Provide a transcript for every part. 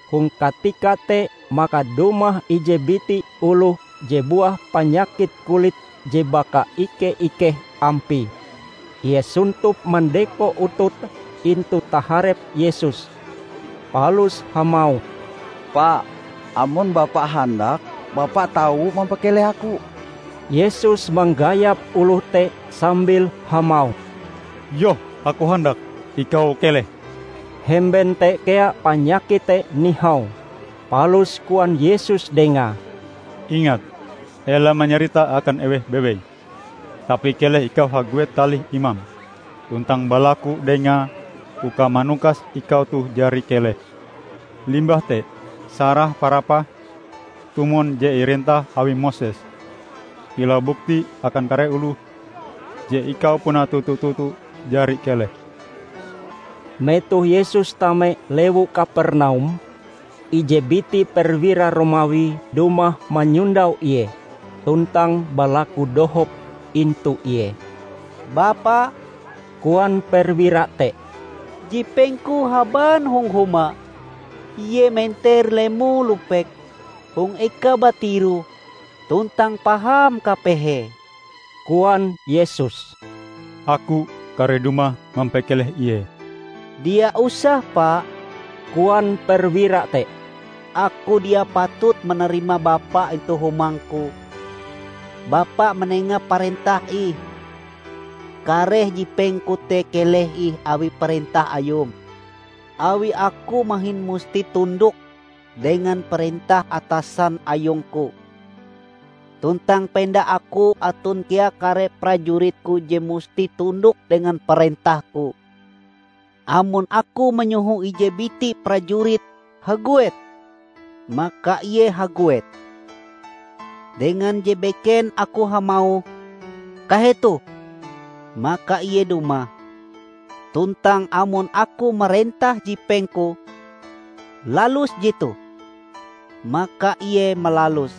Hong katika te maka dumah ije biti oloh je buah panyakit kulit je bakaike-ikeh ampie. Ie sontop mandeko utute intu taharep Yesus, palus hamauh, "Pa, amon Bapa handak, Bapa tau mampakeleh aku." Yesus manggayap oloh te sambil hamauh, "Yoh Aku handak. Ikau keleh!" Hemben te kea panyakite te nihau. Palus koan Yesus dengae, "Ingat! Ela manyaritae akan eweh bewei. Tapi keleh ikau haguet talih imam, tuntang balaku dengae uka manukas ikau toh jari keleh. Limbah te sarah parapahm tumon je irentah awi Moses, kilau bukti akan kare oloh je ikau puna toto-toto jari keleh!" Metoh Yesus tame lewu Kapernaum, ije biti perwira Romawi dumah manyondau Ie, tuntang balaku dohop intu Ie. "Bapa," koan perwira te, "jipengku haban hong huma. Ie menter lemo-lupek hong ekae batiroh tuntang paham kapehee." Koan Yesus, "Aku kareh dumah mampakeleh ie." "Dia usah Pa," koan perwira te, "Aku dia patut manarima Bapa intu humangku. Bapa manenga parentah ih. Kareh jipengku te keleh ih awi parentah Ayum. Awi aku mahin musti tundok dengan parentah atasan ayungku. Tuntang penda aku aton kea kare prajuritku je musti tundok dengan parentahku. Amon aku manyoho ije biti prajurit 'Haguet!' maka ie haguet. Dengan je beken aku hamauh 'Kahetoh!' maka ie dumah; tuntang amon aku marentah jipengku 'Lalus jetoh!' maka ie malaluse."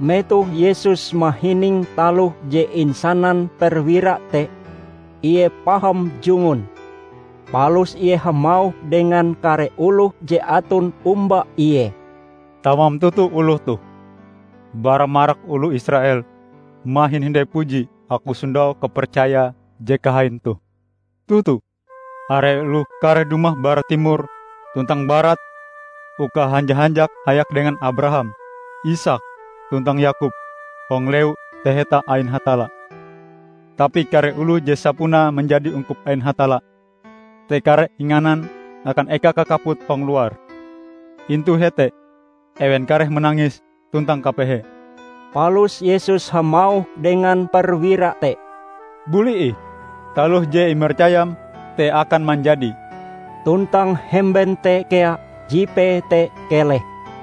Metoh Yesus mahining taloh je insanan perwira te, Ie paham jungun. Palus Ie hamauh dengan kare oloh je aton omba Ie, "Tamam toto oloh toh. Bara marak oloh Israel mahin hindai puji Aku sondau kapercaya je kahain toh! Toto! Are oloh kareh dumah bara timor tuntang barat uka hanja-hanjak hayak dengan Abraham, Isaak tuntang Yakob hong Lewu Taheta ain Hatalla. Tapi kare oloh je sapunae manjadi ungkup ain Hatalla te kareh inganan akan eka kakaput hong luar. Intu hete ewen kareh manangis tuntang kapehe." Palus Yesus hamauh dengan perwira te, "Buli ih, taloh je imercayam te akan manjadi." Tuntang hemben te kea jipee te keleh.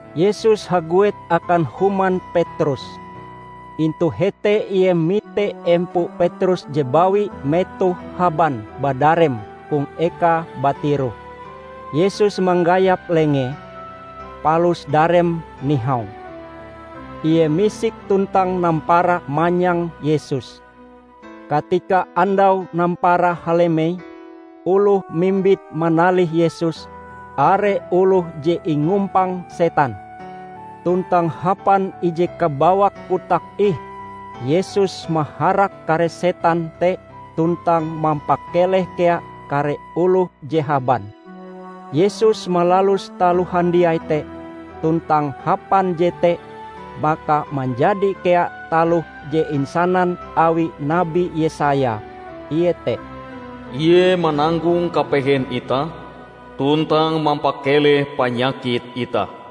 Yesus haguet akan human Petrus. Intu hete Ie mite empo Petrus je bawi metohe haban badarem hong ekae batiroh. Yesus manggayap lengee, palus dareme nihau. Ie misik tuntang nampara manyang Yesus. Katika andau nampara halemei, oloh mimbit manalih Yesus, are oloh je ingumpang setan. Tuntang hapan ije kabawak kotak ih, Yesus maharak kare setan te tuntang mampakeleh kea kare oloh je haban. Yesus malalus taloh handiai te, tuntang hapan jete maka manjadi kea taloh je insanan awi Nabi Yesaya, iete, "Ie mananggong kapehen itah tuntang mampakeleh panyakit itah."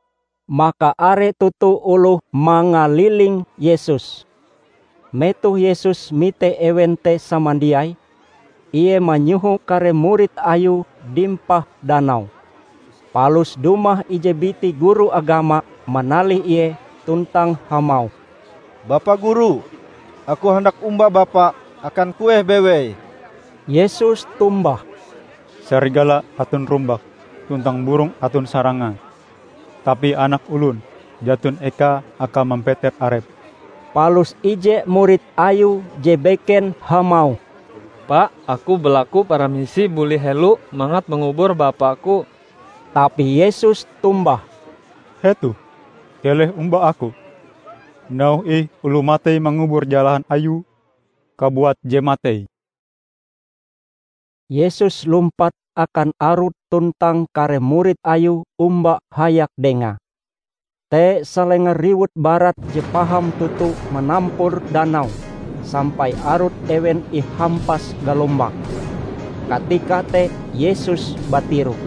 Maka are toto oloh mangaliling Yesus. Metoh Yesus mite ewen te samandiai, Ie manyoho kare murid Ayue dimpah danau. Palus dumah ije biti guru agama manalih Ie tuntang hamauh, "Bapa Guru, aku handak omba Bapa akan kueh bewei!" Yesus tombah, "Sarigala aton rumbake, tuntang burong aton sarangae, tapi Anak Olon jaton eka Akae mampeter arep." Palus ije murid Ayue je beken hamauh, "Pa, aku balaku paramisi buli helo mangat mangubur bapaku." Tapi Yesus tombah, "Hetoh, keleh omba Aku, nauhe ih oloh matei mangubur jalahan ayue kabuat je matei!" Yesus lumpat akan arut tuntang kare murid Ayue omba hayak Dengae. Te salenga riwut barat je paham toto manampur danau sampai arut ewen ihampas galombang. Katika te Yesus batiroh.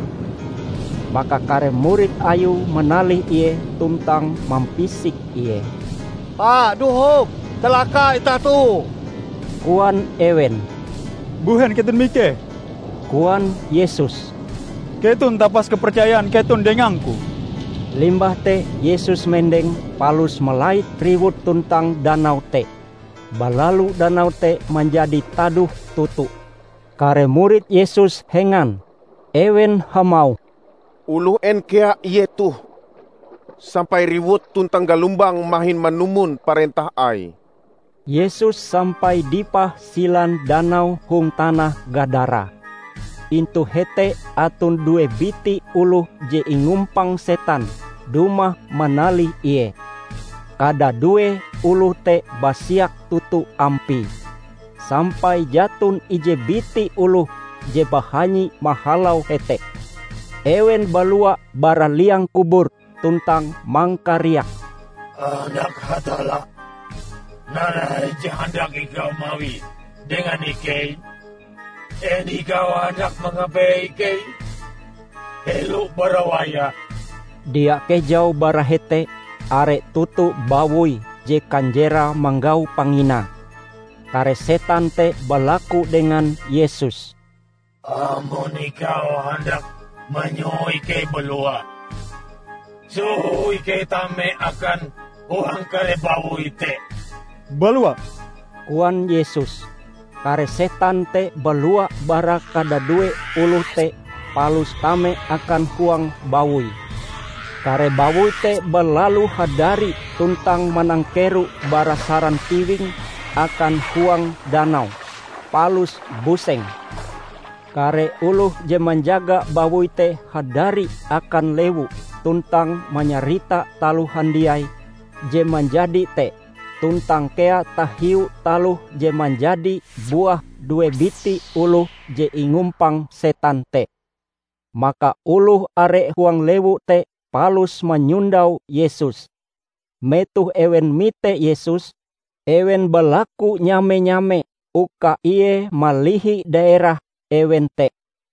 Maka kare murid Ayue manalih Ie tuntang mampisik Ie. "Pa! Dohop! Calaka itah toh!" koan ewen. "Mbuhen keton mikeh?" koan Yesus. "Keton tapas kepercayan keton dengang-Ku!" Limbah te Yesus mendeng palus malait riwut tuntang danau te. Balalu danau te manjadi tadoh toto. Kare murid Yesus hengan. Ewen hamauh, "Oloh en kea Ie toh, sampai riwut tuntang galombang mahin manumon parentah Aie!" Yesus sampai dipah silan danau hong tanah Gadara. Intu hete aton due biti oloh je ingumpang setan dumah manalih Ie. Kadadue oloh te basiak toto ampie, sampai jaton ije biti oloh je bahanyi mahalau hete. Ewen balua bara liang kubur tuntang mangkariak, "Anak Hatalla, narai je handak Ikau mawie dengan ikei? En Ikau handak mangapehe ikei helo bara wayahe?" Dia kejau bara hete are toto bawoi je kanjerae manggau panginae. Kare setan te balaku dengan Yesus, "Amon Ikau handak manyoho ikei balua, soho ikei tame akan huang kare bawoi te." "Balua!" koan Yesus. Kare setan te balua bara kadadue oloh te palus tame akan huang bawoi. Kare bawoi te balalu hadari tuntang manangkero bara saran tiwing akan huang danau, palus buseng. Kare oloh je manjaga bawoi te hadari akan lewu tuntang manyarita taloh handiai je manjadi te, tuntang kea tahiu taloh je manjadi buah due biti oloh je ingumpang setan te. Maka oloh are huang lewu te palus manyondau Yesus. Metoh ewen mite Yesus, ewen balaku nyame-nyame uka Ie malihi daerah ewen te.